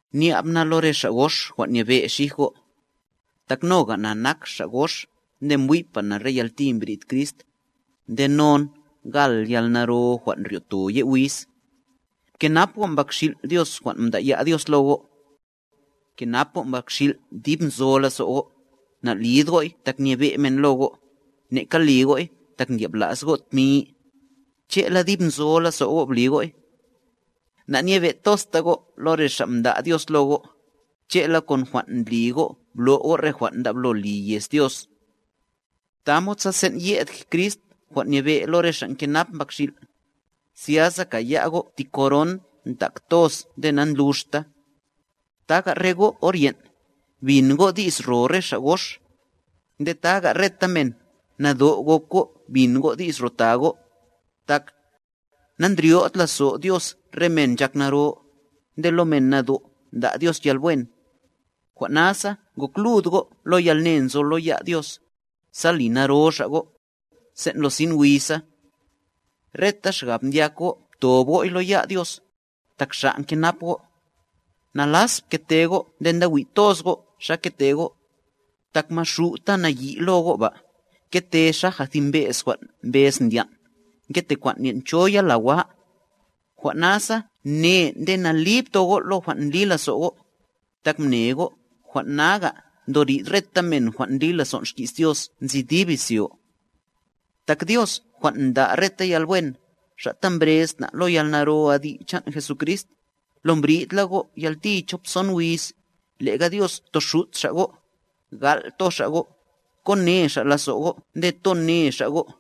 Nya'b na lo re xa' gox jwan' nyebe' xij go', tak noga na nak xa' gox nde mbwi'pa na re yalti mbrid Crist, nde non gal yalnaro jwan' ryo'to ye' wíz. Pkenap go' mbakxil' Dios jwan' mda'ya' Dios lo go'. Pkenap go' mbakxil' dib nzo lazo' go', na'lid go'y tak nyebe' men lo go', neka li go'y tak ndyabla's go' tmi, che'la dib nzo lazo' go' bli go'y. Na'nyebe'tozta go' lo re xa' mda' Dios lo go', che'la kon jwan' ndli go' blo' go' re jwan' ndablo li yez Dios. Tamod sa sen' ye'd Crist jwan' nyebe' lo re xa' ngenap mbakxil', zyasa kaya' go' ti koron ndak toz nde nandluxta. Taga re go' or yen', bin go' di's ro re xa' gox. Nde taga reta men, nado' gok go' bin go' di's ro ta go', tak: Nandryo'd lazo Dios re men nchak naro, Nde lo men nado' nda' Dios yalwen. Jwan' nasa gok lud go' lo yalne nzo lo ya' Dios, sa li naro Xa' go', sen' lo sin wiza. Reta xgab ndyak go' ptob go'y lo ya' Dios, tak Xa' nkenap go'. Nalas pkete go' nde nda wi' toz go' xa kete go', tak Maxu' ta nayi' lo go' ba, ngete xaja thi mbe's jwan' mbez ndyan', ngete kwan' nyen' cho yala wa. Jwan' nasa ne nde nali pto go' lo jwan' ndli lazo' go', tak mne go' jwan' naga' ndo rid reta men jwan' ndli lazon' xki's Dios nzi dib izyo. Tak Dios jwan' nda' reta yalwen, Xa' ta mbrez na' lo yalnaro adi' chan' Jesucrist, lo mbridla go' yalti chop son wiz, le'ga Dios toxut Xa' go', gal' to Xa' go', ko ne Xa' lazo' go' nde to ne Xa' go'.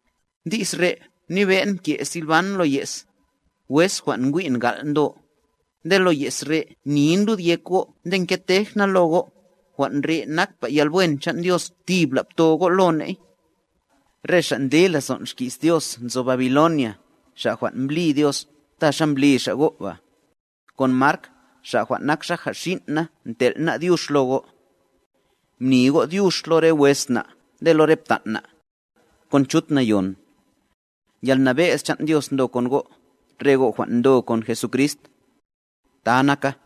Di's re' mnibe'n mke' Silvan lo ye's, wes jwan' ngwi'n gal' ndo, nde lo ye's re' mnin lud yek go' nde ngetej na lo go', jwan' re' nakpa yalwen chan' Dios tibla' pto go' lo ney. Re xa' ndli lazon' xki's Dios nzo Babiloniaa xa' jwan' mblí Dios ta xa mblí Xa' go' ba, kon Mark xa' jwan' nak xaja xin' na ntel' ná' dyux lo go'. Mni go' dyux lo re wes na' nde lo re ptan' na', kon chut nayon. Yalnabe'z chan' Dios ndo kon go', re go' jwan' ndo kon Jesucrist. Ta naka.